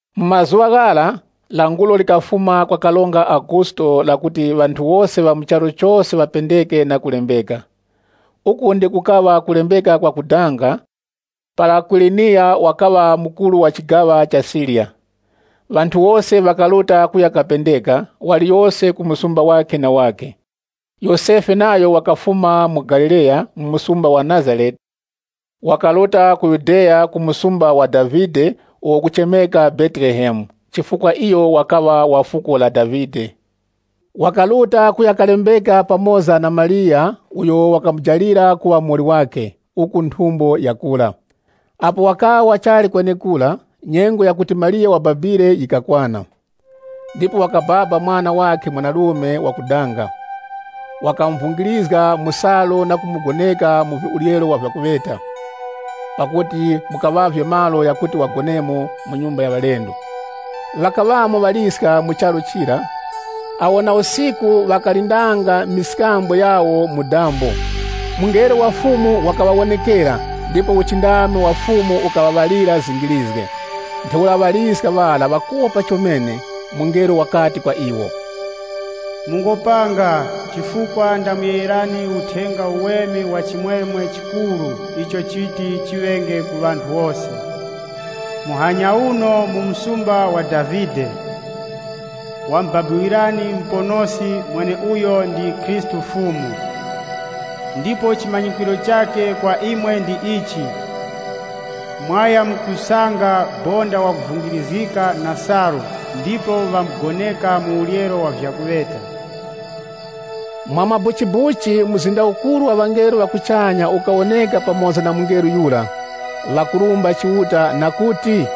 Mu mazuŵa ghara, Karonga Augusto wakafumiska languro lakuti ŵanthu wose ŵa mu charu chose ŵapendeke na kulembeka. Uku ndiko kukaŵa kulembeka kwa kudanga, para Kwiriniya wakaŵa mukuru wa chigaŵa cha Siriya. Ŵanthu wose ŵakaruta kuya kalembeka, waliyose ku msumba wakhe na wakhe. Yosefe nayo wakafuma mu Galileya, mu msumba wa Nazarete, wakaruta ku Yudeya, ku msumba wa Davide uwo ukuchemeka Betelehemu, chifukwa iyo wakaŵa wa fuko la Davide. Wakaruta kuya kalembeka pamoza na Mariya, uyo wakamujalira kuŵa muwoli wakhe, uku nthumbo yakura. Apo wakaŵa wachali kwenekura, nyengo yakuti Mariya wababire yikakwana. Ndipo wakababa mwana wakhe wa uŵere mwanarume. Wakamuvungirizga mu salu na kumugoneka mu uryero wa vyakuŵeta, pakuti mukaŵavye malo ghakuti ŵagonemo mu nyumba ya ŵalendo. Ŵakaŵamo ŵaliska mu charu chira, awo na usiku ŵakalindanga mberere zawo mu dambo. Mungelo wa Fumu wakaŵawonekera, ndipo uchindami wa Fumu ukaŵaŵalira zingirizge. Ntheura ŵaliska ŵara ŵakopa chomene. Mungelo wakati kwa iwo, “Mungopanga, chifukwa ndamuyegherani Uthenga Uweme wa chimwemwe chikuru icho chiti chiŵenge ku ŵanthu wose. Muhanya uno mu msumba wa Davide, wamubabiwirani Muponoski mweneuyo ndi Khristu Fumu. Ndipo chimanyikwiro chakhe kwa imwe ndi ichi: mwayamkusanga bonda wakuvungirizgika na salu ndipo ŵamugoneka mu uryero wa vyakuŵeta.” Mwamabuchibuchi mzinda ukuru wa ŵangelo ŵa kuchanya ukawoneka pamoza na mungelo yura. Ukarumbanga Chiuta na mazgu ghakuti,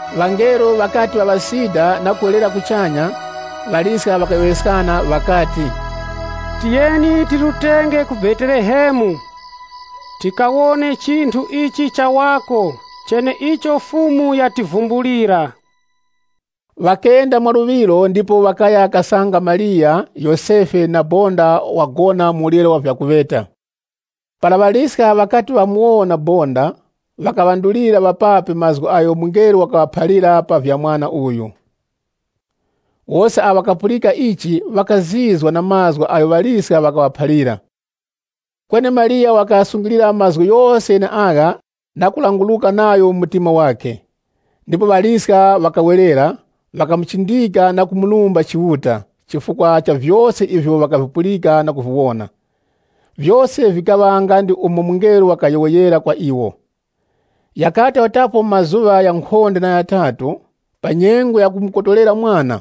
Ŵangelo ŵakati ŵaŵasida na kuwerera kuchanya, ŵaliska ŵakayowoyeskana ŵakati, “Tiyeni tirutenge ku Betelehemu, tikawone chinthu ichi chawako, cheneicho Fumu yativumbulira.” Ŵakenda mwaluŵiro ndipo ŵakaya kasanga Mariya, Yosefe, na bonda wagona mu uryero wa vyakuŵeta. Para ŵaliska ŵakati ŵamuwona bonda, ŵakaŵandulira ŵapapi mazgu agho mungelo wakaŵaphalira pa vya mwana uyu. Wose awo ŵakapulika ichi, ŵakazizwa na mazgu agho ŵaliska ŵakaŵaphalira. Kweni Mariya wakaghasungilira mazgu ghose gheneagha na kulanguruka nagho mu mtima wakhe. Ndipo ŵaliska ŵakawerera, ŵakamuchindika na kumurumba Chiuta, chifukwa cha vyose ivyo ŵakavipulika na kuviwona. Vyose vikaŵa nga ndi umo mungelo wakayowoyera kwa iwo. Ghakati gharutapo mazuŵa ghankhonde na ghatatu, pa nyengo ya kumukotorera mwana,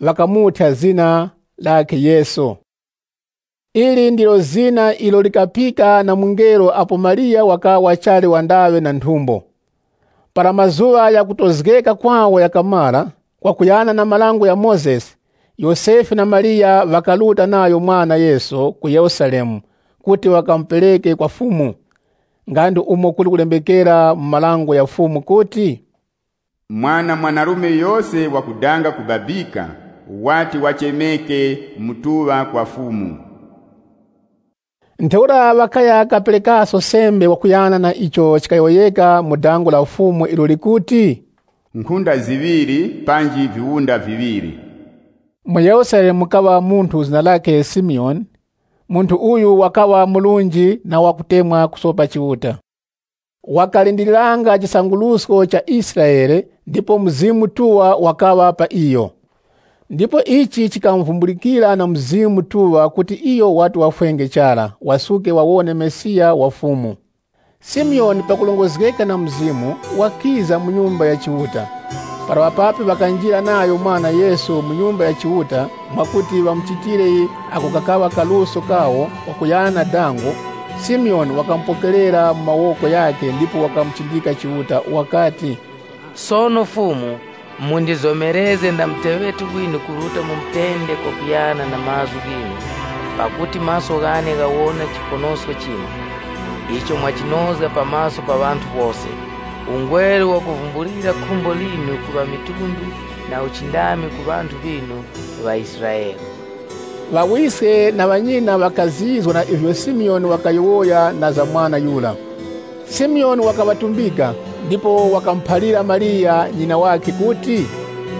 ŵakamuthya zina lakhe Yesu. Ili ndilo zina ilo likapika na mungelo apo Mariya wakaŵa wachali wandaŵe na nthumbo. Para mazuŵa ghakutozgeka kwawo ghakamara, kwakuyana na Dango la Mozesi, Yosefe na Mariya ŵakaruta nayo mwana Yesu ku Yerusalemu kuti ŵakamupereke kwa Fumu. Nga ndi umo kuli kulembekera mu marango gha Fumu kuti, “Mwana yose mwanarume wa uŵere, wati wachemeke wakupatulika kwa Fumu.” Ntheura ŵakaya kaperekaso sembe kwakuyana na icho chikuyowoyeka mu dango la Fumu ilo likuti, “Nkhunda ziŵiri panji viwunda viŵiri.” Mu Yerusalemu mukaŵa munthu zina lakhe Simiyoni. Munthu uyu wakaŵa murunji na wakutemwa kusopa Chiuta. Wakalindiriranga chisangurusko cha Israele ndipo Mzimu Mutuŵa wakaŵa pa iyo. Ndipo ichi chikamuvumbulikira na Mzimu Mutuŵa kuti iyo wati wafwenge chara, wasuke wawone Mesiya wa Fumu. Simiyoni pakurongozgeka na Mzimu, wakiza mu Nyumba ya Chiuta. Para ŵapapi ŵakanjira nayo mwana Yesu mu Nyumba ya Chiuta, mwakuti ŵamuchitire ako kakaŵa kaluso kawo kwakuyana na dango, Simiyoni wakamupokerera mu mawoko ghakhe ndipo wakamuchindika Chiuta wakati, “Fumu, sono mundizomerezge nda muteŵeti winu kuruta mu mutende kwakuyana na mazgu ghinu. Pakuti maso ghane ghawona chiponosko chinu, icho mwachinozga pa maso pa ŵanthu wose. Ungweru wakuvumbulira khumbo linu ku ŵamitundu, na uchindami ku ŵanthu ŵinu ŵaIsraele.” Ŵawiske na ŵanyina ŵakazizwa na ivyo Simiyoni wakayowoya na za mwana yura. Simiyoni wakaŵatumbika, ndipo wakamuphalira Mariya ŵanyina ŵakhe kuti,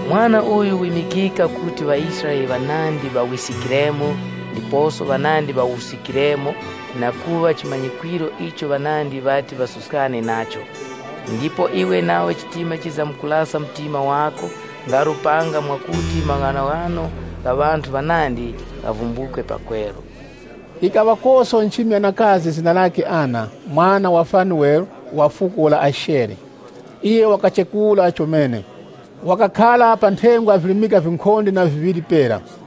“Mwana uyu wimikika kuti ŵaIsraele ŵanandi ŵawiskikiremo ndiposo ŵanandi ŵawuskikiremo na kuŵa chimanyikwiro icho ŵanandi ŵati ŵasuskane nacho, ndipo iwe nawe chitima chizamkulasa mtima wako nga lupanga mwakuti maghanoghano gha ŵanthu ŵanandi ghavumbukwe pakweru.” Yikaŵakoso nchimi yanakazi zina lakhe Ana, mwana wa Fanuele, wa fuko la Ashere. Iyo wakachekura chomene. Wakakhara pa nthengwa virimika vinkhonde na viŵiri pera.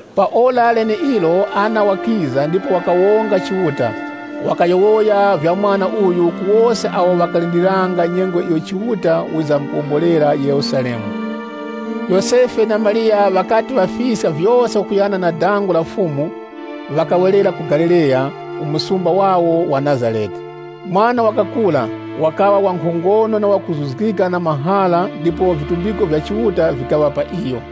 Pa ora leneilo Ana wakiza ndipo wakawonga Chiuta, wakayowoya vya mwana uyu ku wose awo ŵakalindiriranga nyengo iyo Chiuta wizamkuwombolera Yerusalemu. Yosefe na Mariya ŵakati ŵafiska vyose kwakuyana na dango la Fumu, ŵakawerera ku Galileya, ku msumba wawo wa Nazarete. Mwana wakakura, wakaŵa wankhongono na wakuzuzgika na mahara ndipo vitumbiko vya Chiuta vikaŵa pa iyo.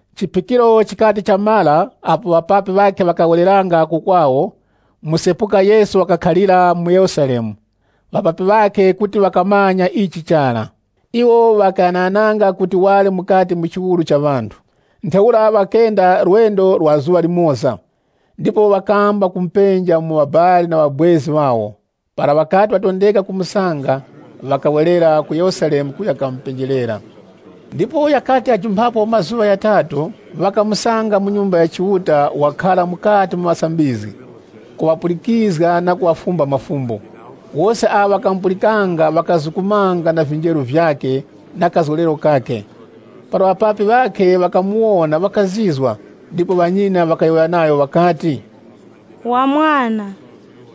Chiphikiro chikati chamara, apo ŵapapi ŵakhe ŵakawereranga ku kwawo, msepuka Yesu wakakhalira mu Yerusalemu. Ŵapapi ŵakhe kuti ŵakamanya ichi chara. Iwo ŵakaghanaghananga kuti wali mukati mu chiwuru cha ŵanthu. Ntheura ŵakenda lwendo lwa zuŵa limoza. Ndipo ŵakamba kumupenja mu ŵabali na ŵabwezi ŵawo. Para ŵakati ŵatondeka kumusanga, ŵakawerera ku Yerusalemu kuya kamupenjerera. Ndipo ghakati ghajumphapo mazuŵa ghatatu, ŵakamusanga mu Nyumba ya Chiuta, wakhara mukati mu ŵasambizgi, kuŵapulikizga na kuŵafumba mafumbo. Wose awo ŵakamupulikanga ŵakazukumanga na vinjeru vyakhe na kazgolero kakhe. Para ŵapapi ŵakhe ŵakamuwona ŵakazizwa, ndipo ŵanyina ŵakayowoya nayo ŵakati, “Wa Mwana,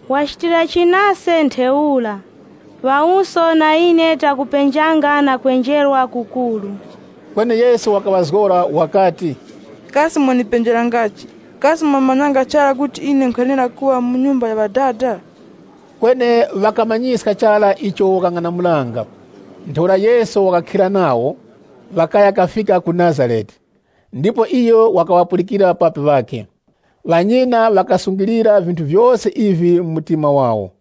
wachitirachi nase ntheura? Ŵawuso na ine takupenjanga na kwenjerwa kukuru.” Kweni Yesu wakaŵazgora wakati, “Kasi mwandipenjerangachi? Kasi mwamanyanga chara kuti ine nkhwenera kuŵa mu Nyumba ya Ŵadada?” Kweni ŵakamanyiska chara icho wakang'anamulanga. Ntheura Yesu wakakhira nawo, ŵakaya kafika ku Nazarete. Ndipo iyo wakaŵapulikira ŵapapi wakhe. Ŵanyina ŵakasungilira vinthu vyose ivi mu mtima wawo.